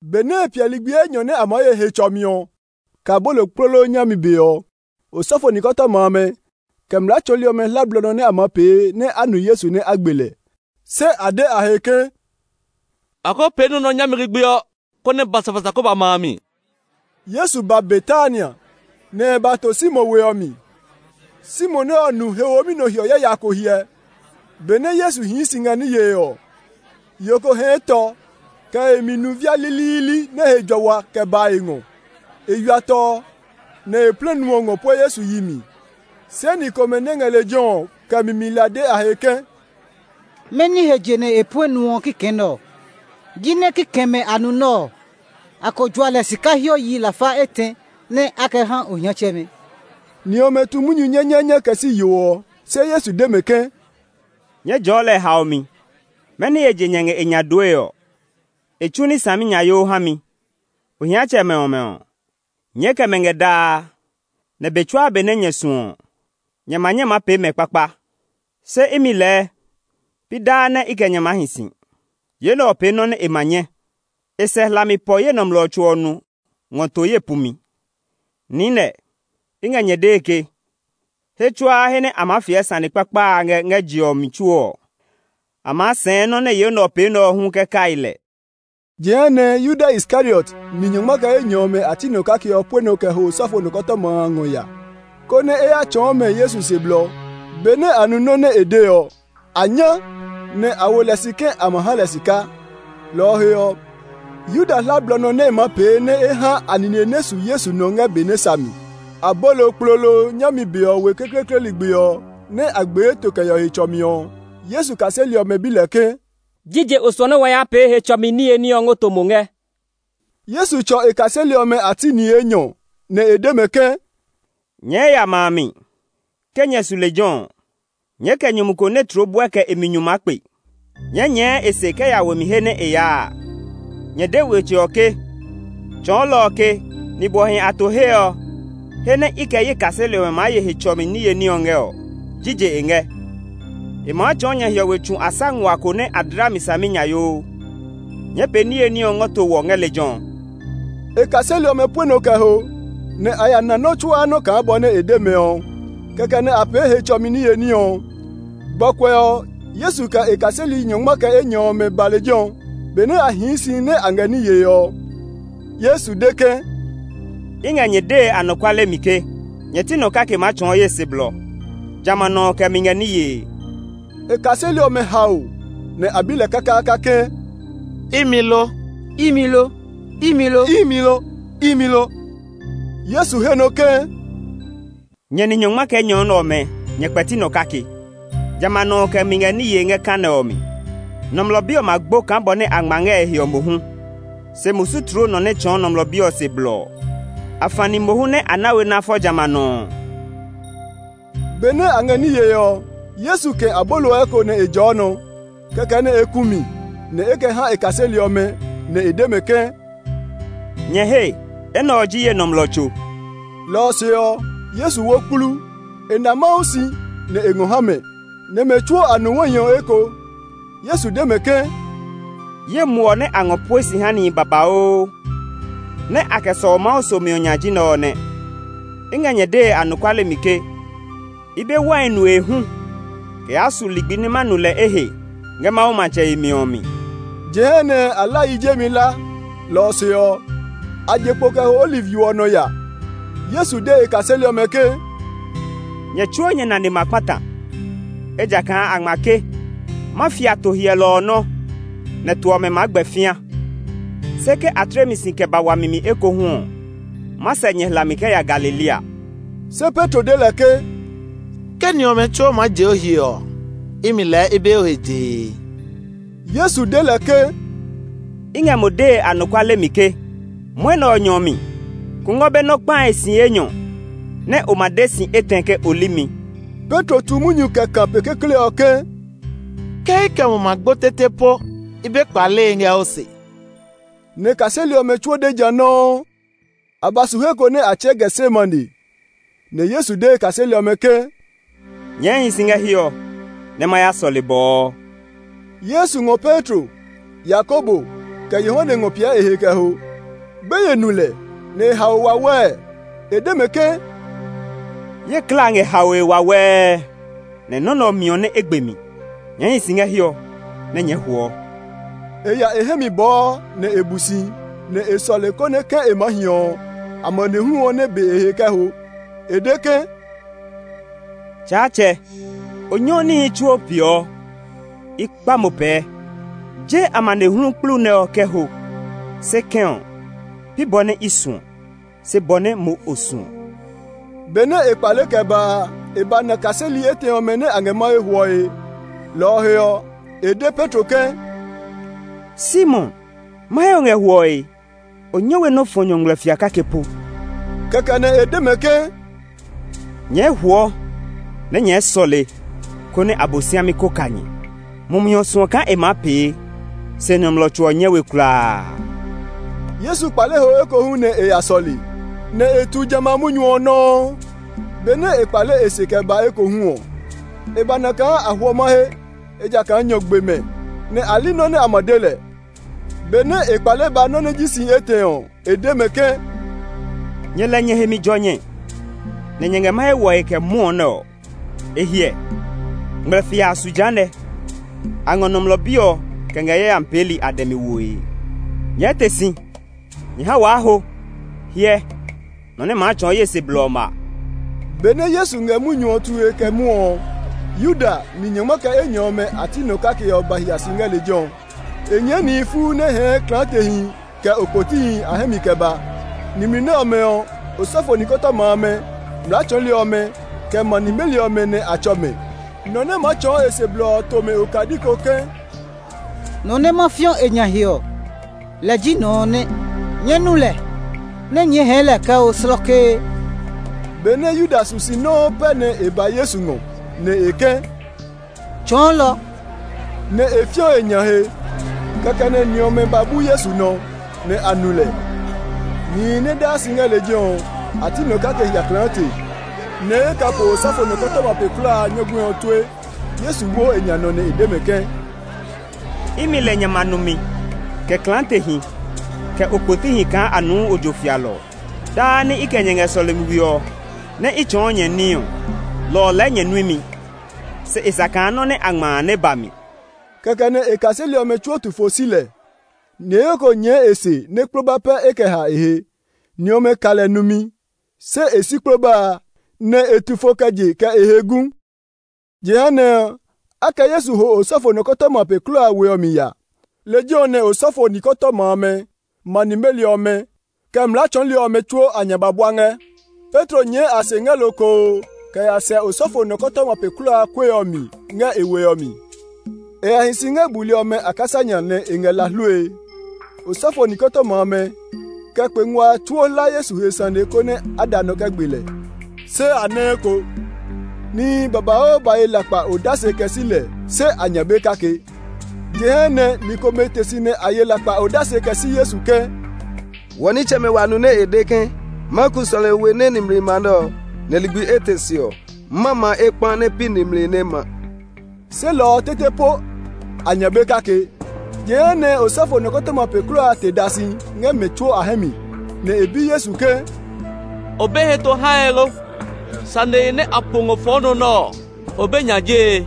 Benɛ e piɛ ligbi enyɔ nɛ a maa ye Hetsɔmi ɔ, kɛ Abolokplolo nyami be ɔ, osɔfo nikɔtɔma amɛ, kɛ mlaa tsɔɔli ɔmɛ hla bɔ nɛ a maa pee nɛ a nu Yesu ga mi nɛ a gbe lɛ. Se a de a he ke, “Wa ko pee nɔ́ nɛ ɔ nyami ligbi ɔ, konɛ basabasa ko ba ma a mi.” Yesu ba Betania, nɛ e ba to Simon we ɔ mi. Simon nɛ ɔ nu he womi nɔ hiɔ yaya ko hyɛ. Benɛ Yesu hii si ngɛ ní yee ɔ, yo ko hɛɛ tɔ kɛ e mi nu via liliili nɛ he jua wa kɛ ba e ngɔ. E ywia tɔ ɔ, nɛ e plɛ nu ɔ ngɔ pue Yesu yi mi. Se ni komɛ nɛ ngɛ lejɛ ɔ kɛ mi mi la de a he ke, “Mɛni he je nɛ e puɛ nu ɔ kikɛ nɛ ɔ? Jinɛ kikɛmɛ a nu nɛ ɔ, a ko jua lɛ sika hiɔ yi lafa etɛ nɛ́ a kɛ ha ohiatsɛmɛ.” Ni ɔmɛ tu munyu nyanyaanya kɛ si yo ɔ. Se Yesu de mɛ ke, “Nyɛɛ jɔɔ lɛ haomi! Mɛni he je nyɛ ngɛ e nya dooe ɔ? E tsu ní saminyayoo ha mi. Ohiatsɛmɛ ɔmɛ ɔ, nyɛɛ kɛ mɛ ngɛ daa, nɛ be tsuaa be nɛ nyɛ suɔ ɔ, nyɛ ma nyɛ maa pee mɛ kpakpa; se imi lɛɛ pi daa nɛ i kɛ nyɛ maa hi si. Yo nɛ ɔ pee nɔ́ nɛ e ma nyɛ. E sɛ hlami pɔ ye nɔmlɔ tso ɔ nu ngɔ to ye pumi. Niinɛ, i ngɛ nyɛ dee ke, he tsuaa he nɛ a maa fiɛ sane kpakpa a ngɛ ngɛ je ɔ mi tsuo ɔ, a maa sɛɛ nɔ́ nɛ yo nɛ ɔ pee nɛ ɔ hu kɛ kai lɛ.” Jehanɛ Yuda Iskariot, ni nyɔngma kɛ enyɔ ɔmɛ a ti nɔ kake ɔ pue nɔ kɛ ho osɔfo nikɔtɔma amɛ a ngɔ ya, konɛ e ya tsɔɔ mɛ Yesu se blɔ. Benɛ a nu nɔ́ nɛ e de ɔ, a nyá, nɛ a wo lɛ si ke a ma ha lɛ sika. Lɔ ɔ he ɔ, Yuda hla bɔ nɛ e maa pee nɛ e ha a nine nɛ su Yesu nɔ ngɛ be nɛ sa mi. Abolokplolo nyami be ɔ we kekleekle ligbi ɔ nɛ a gbee to kɛ yeɔ Hetsɔmi ɔ, Yesu kaseli ɔmɛ bi lɛ ke, “Jije o suɔ nɛ wa ya pee Hetsɔmi niye ní ɔ ngɔ to mo ngɛ?” Yesu tsɔ e kaseli ɔmɛ a ti ni enyɔ, nɛ e de mɛ ke, “Nyɛɛ ya ma a mi. Ke nyɛ su lejɛ ɔ, nyɛɛ kɛ nyumu ko nɛ tloo buɛ kɛ e mi nyu maa kpe. Nyɛɛ nyɛɛ e se kɛ ya we mi he nɛ e yaa a. Nyɛ de wetsɛ ɔ ke, Tsɔɔlɔ ɔ ke, ‘Nibwɔhi a to he ɔ, he nɛ i kɛ ye kaseli ɔmɛ maa ye Hetsɔmi niye ní ɔ ngɛ ɔ, jije e ngɛ?’ E maa tsɔɔ nyɛ hiɔwe tsu asa nguaa ko nɛ a dla mi saminyayoo. Nyɛɛ pee niye ní ɔ ngɔ to wɔ ngɛ lejɛ ɔ.” E kaseli ɔmɛ pue nɔ kɛ ho, nɛ a ya na nɔ́ tsuaa nɔ́ kaa bɔ nɛ e de mɛ ɔ. Kɛkɛ nɛ a pee Hetsɔmi niye ní ɔ. Gbɔkuɛ ɔ, Yesu kɛ e kaseli nyɔngma kɛ enyɔ ɔmɛ ba lejɛ ɔ. Benɛ a hii si nɛ a ngɛ ní yee ɔ, Yesu de ke, “I ngɛ nyɛ dee anɔkuale mi ke, Nyɛ ti nɔ kake maa tsɔɔ ye se blɔ; jamɛ a nɔ ɔ kɛ mi ngɛ ní yee.” E kaseli ɔmɛ hao, nɛ a bi lɛ kakaaka ke, “Imi lo? Imi lo?” Yesu he nɔ ke, “Nyɛ ni nyɔngma kɛ enyɔ nɛ ɔmɛ nyɛ kpɛti nɔ kake; jamɛ a nɔ ɔ kɛ mi ngɛ ní yee ngɛ ka nɛ ɔ mi. Nɔmlɔ Bi ɔ ma gbo kaa bɔ nɛ a ngma ngɛ e he ɔ mohu, se musu tloo nɔ nɛ tsɔɔ Nɔmlɔ Bi ɔ se blɔ ɔ! Afani mohu nɛ a na we nɛ a fɔ jamɛ a nɔ ɔ.” Benɛ a ngɛ ní yee ɔ, Yesu kɛ̃ abolo ɔ eko nɛ e jɔɔ nɔ; kɛkɛ nɛ e ku mi, nɛ e kɛ ha e kaseli ɔmɛ, nɛ e de mɛ ke, “Nyɛ hee! Enɛ ɔ ji ye nɔmlɔ tso.” Lɔ ɔ se ɔ, Yesu wo kplu; e na Mawu si, nɛ e ngɔ ha mɛ, nɛ mɛ tsuo a nu wai ɔ eko. Yesu de mɛ ke, “Ye muɔ nɛ a ngɔ pue si ha nihi babauu nɛ a kɛ sɔu Mawu somi ɔ nya ji nɛ ɔ nɛ. I ngɛ nyɛ dee anɔkuale mi ke, i be wai nue hu kɛ yaa su ligbi nɛ ma nu lɛ ehe ngɛ Mawu matsɛ yemi ɔ mi.” Jehanɛ a la yi jemi la, lɔ ɔ se ɔ, a je kpo kɛ ho Oliv yo ɔ nɔ ya. Yesu de e kaseli ɔmɛ ke, “Nyɛ tsuo nyɛ nane ma kpata, ejakaa a ngma ke, ‘Ma fia to hyɛlɔ ɔ nɔ́, nɛ to ɔmɛ maa gbɛ fĩa.’ Se ke a tle mi si kɛ ba wami mi ekohu ɔ, ma sɛ nyɛ hlami kɛ ya Galilea.” Se Petro de lɛ ke, “Ke ni ɔmɛ tsuo maa je o he ɔ, imi lɛɛ i be o he jee.” Yesu de lɛ ke, “I ngɛ mo dee anɔkuale mi ke, mwɔnɛ ɔ nyɔ mi kungwɔ be nɔ kpae si enyɔ nɛ o ma de si etɛ ke o li mi.” Petro tu munyu kɛ kã pe kekle ɔ ke, “Ke i kɛ mo ma gbo tete po i be kpalee ngɛ o se!” Nɛ kaseli ɔmɛ tsuo de ja nɔuu. A ba su he ko nɛ a tsɛɛ Getsemane, nɛ Yesu de e kaseli ɔmɛ ke, “Nyɛɛ hi si ngɛ hiɛ ɔ nɛ ma ya sɔle bɔɔ.” Yesu ngɔ Petro, Yakobo, kɛ Yohane ngɔ piɛ e he kɛ ho. Gbeye nu lɛ, nɛ e hao wawɛɛ. E de mɛ ke, “Ye klaa ngɛ haoe wawɛɛ, nɛ nɔ́ nɛ ɔ miɔ nɛ e gbe mi. Nyɛɛ hi si ngɛ hiɛ ɔ nɛ nyɛɛ huɔ!” E ya e hɛ mi bɔɔ, nɛ e bu si, nɛ e sɔle konɛ ke e maa hi ɔ, amanehlu ɔ nɛ be e he kɛ ho. E de ke, “Tsaatsɛ! O nyɛɔ níhi tsuo peeɔ! I kpa mo pɛɛ, je amanehlu kplu nɛ ɔ kɛ ho; se kɛ̃ ɔ, pi bɔ nɛ i suɔ, se bɔ nɛ mo o suɔ.” Benɛ e kpale kɛ ba a, e ba na kaseli etɛ ɔmɛ nɛ a ngɛ mahe hwɔe. Lɔ ɔ he ɔ, e de Petro ke, “Simon, mahe o ngɛ hwɔe? O nyɛ we nɛ o fɔ nyɔ ngmlɛfia kake po?” Kɛkɛ nɛ e de mɛ ke, “Nyɛɛ huɔ nɛ nyɛɛ sɔle konɛ Abosiami ko ka nyɛ. Mumi ɔ suɔ kaa e maa pee, se nɔmlɔ tso ɔ nyɛ we kulaa.” Yesu kpale ho ekohu nɛ e ya sɔle, nɛ e tu jamɛ a munyu ɔ nɔuu. Benɛ e kpale e se kɛ ba ekohu ɔ, e ba na kaa a hwɔ mahe, ejakaa nyɔ gbe mɛ, nɛ a li nɔ́ nɛ a ma de lɛ. Benɛ e kpale ba nɔ́ nɛ ji si etɛ ɔ, e de mɛ ke, “Nyɛ lɛ nyɛ he mi jɔ nyɛ nɛ nyɛ ngɛ mahe hwɔe kɛ mwɔɔ nɛ ɔ? E hiɛ! Ngmlɛfia a su jehanɛ; a ngɔ Nɔmlɔ Bi ɔ kɛ ngɛ yayami peeli a dɛ mi woe. Nyɛɛ te si; nyɛ ha waa ho! Hyɛ, nɔ nɛ maa tsɔɔ ye se blɔ ɔ ma.” Benɛ Yesu ngɛ munyu tue kɛ mwɔɔ ɔ, Yuda, ni nyɔngma kɛ enyɔ ɔmɛ a ti nɔ kake ɔ ba hia si ngɛ lejɛ ɔ. E nyɛɛ nihi fuu nɛ hɛɛ klaatehi kɛ okpotihi a hɛ mi kɛ ba. Nimli nɛ ɔmɛ ɔ, osɔfo nikɔtɔma amɛ, mlaa tsɔɔli ɔmɛ, kɛ ma nimeli ɔmɛ nɛ a tsɔ mɛ. Nɔ nɛ maa tsɔɔ e se blɔ ɔ to mɛ okadi ko ke, “Nɔ nɛ ma fiɔ e nya he ɔ, lɛ ji nɔ ɔ nɛ; nyɛɛ nu lɛ, nɛ nyɛɛ hɛɛ lɛ kɛ ho slɔkee.” Benɛ Yuda su si nɔuu pɛ nɛ e ba Yesu ngɔ, nɛ e ke, “Tsɔɔlɔ!” nɛ e fiɔ e nya he. Kɛkɛ nɛ ni ɔmɛ ba bu Yesu nɔ, nɛ a nu lɛ. Nihi nɛ daa si ngɛ lejɛ ɔ, a ti nɔ kake hia klaate nɛ e kɛ po osɔfo nɔkɔtɔma pe kulaa a nyɔguɛ ɔ tue. Yesu wo e nya nɔ nɛ e de mɛ ke, “Imi lɛ nyɛ ma numi kɛ klaatehi kɛ okpotihi kaa a nuu ojo fialɔ ɔ? Daa nɛ i kɛ nyɛ ngɛ sɔlemi we ɔ, nɛ́ i tsɔɔ nyɛ ní ɔ, lɔ ɔ lɛɛ nyɛ nui mi; se e sa kaa nɔ nɛ a ngma a nɛ ba mi.” Kɛkɛ nɛ e kaseli ɔmɛ tsuo tu fo si lɛ. Niheyo ko nyɛɛ e se nɛ kploba pɛ e kɛ ha e he. Ni ɔmɛ ka lɛ numi; se e si kploba a, nɛ e tu fo kɛ je kɛ e he gu. Jehanɛ ɔ, a kɛ Yesu ho osɔfo nɔkɔtɔma pe kulaa a we ɔ mi ya. Lejɛ ɔ nɛ osɔfo nikɔtɔma amɛ, ma nimeli ɔmɛ, kɛ mlaa tsɔɔli ɔmɛ tsuo a nya ba bua ngɛ. Petro nyɛɛ a se ngɛ lokoo kɛ ya sɛ osɔfo nɔkɔtɔma pe kulaa a kue ɔ mi ngɛ e we ɔ mi. E ya hi si ngɛ buli ɔmɛ a kasa nya nɛ e ngɛ la hlue. Osɔfo nikɔtɔma amɛ, kɛ kpe ngua a tsuo hla Yesu he sane ko konɛ a da nɔ kɛ gbe lɛ, se a nɛ eko. Nihi babauu ba ye lakpa odase kɛ si lɛ, se a nya be kake. Jehanɛ ni komɛ te si nɛ a ye lakpa odase kɛ si Yesu ke, “Wɔ nitsɛmɛ wa nu nɛ e de ke, ‘Ma ku sɔlemi we nɛ nimli ma nɛ ɔ, nɛ ligbi etɛ se ɔ, ma ma ekpa nɛ pi nimli nɛ ma.’” Se lɔ ɔ tete po, a nya be kake. Jehanɛ, osɔfo nɔkɔtɔma pe kulaa a te da si ngɛ mɛ tsuo a hɛ mi, nɛ e bi Yesu ke, “O be heto hae lo? Sanehi nɛ a po ngɔ fɔ o nɔ nɛ ɔ, o be nya jee?”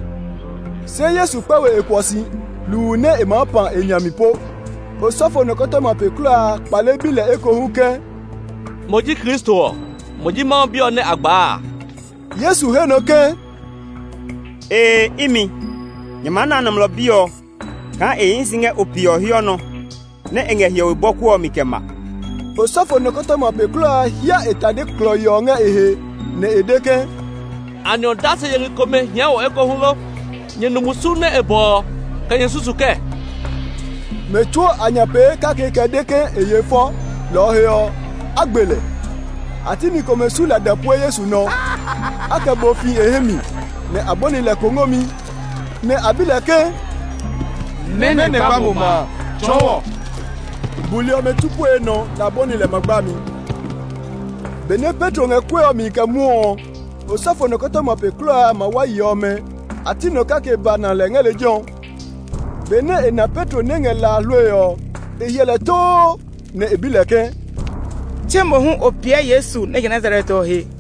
Se Yesu kpɛ we e kuɔ si, hluu nɛ e maa pã e nya mi po. Osɔfo nɔkɔtɔma pe kulaa a kpale bi lɛ ekohu ke, “Mo ji Kristo ɔ? Mo ji Mawu Bi ɔ nɛ a gbaa?” Yesu he nɔ ke, “Ee, imi. Nyɛ maa na Nɔmlɔ Bi ɔ kaa e hii si ngɛ Ope ɔ hiɔ nɔ, nɛ e ngɛ hiɔwe bɔku ɔ mi kɛ ma!” Osɔfo nɔkɔtɔma pe kulaa a hía e tade klɔii ɔ ngɛ e he, nɛ e de ke, “Anɛ odase yeli komɛ hia wɔ ekohu lo? Nyɛ nu musu nɛ e bɔ ɔ? Kɛ nyɛ susu kɛɛ?” Mɛ tsuo a nya pee kake kɛ de ke e yeɔ fɔ, lɔ ɔ he ɔ, a gbe lɛ. A ti ni komɛ su lada pue Yesu nɔ; a kɛ bo fi e hɛ mi, nɛ a bɔni lɛ kongomi; nɛ a bi lɛ ke, “Mɛnɔ gba mo ma a?” Tsɔɔ wɔ. Buli ɔmɛ bu pue e nɔ nɛ a bɔni lɛ ma gbami kpoto kpoto. Benɛ Petro ngɛ kue ɔ mi kɛ mwɔɔ ɔ, osɔfo nɔkɔtɔma pe kulaa a mawayi ɔmɛ a ti nɔ kake ba na lɛ ngɛ lejɛ ɔ. Benɛ e na Petro nɛ ngɛ la hlue ɔ, e hyɛ lɛ too, nɛ e bi lɛ ke, “Tse mo hu o piɛ Yesu nɛ je Nazaret ɔ he?”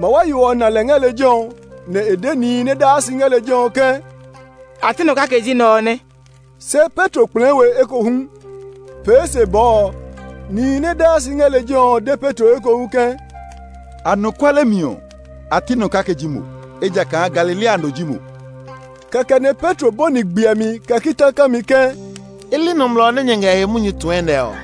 Mawayo ɔ na lɛ ngɛ lejɛ ɔ, nɛ e de nihi nɛ daa si ngɛ lejɛ ɔ ke, “A ti nɔ kake ji nɛ ɔ nɛ!” Se Petro kplɛɛ we ekohu. Pee se bɔɔ ɔ, nihi nɛ daa si ngɛ lejɛ ɔ de Petro ekohu ke, “Anɔkuale mi ɔ, a ti nɔ kake ji mo; ejakaa Galilea no ji mo!” Kɛkɛ nɛ Petro bɔni gbiɛmi kɛ kita kami ke, “I li nɔmlɔ nɛ nyɛ ngɛ e he munyu tue nɛ ɔ!”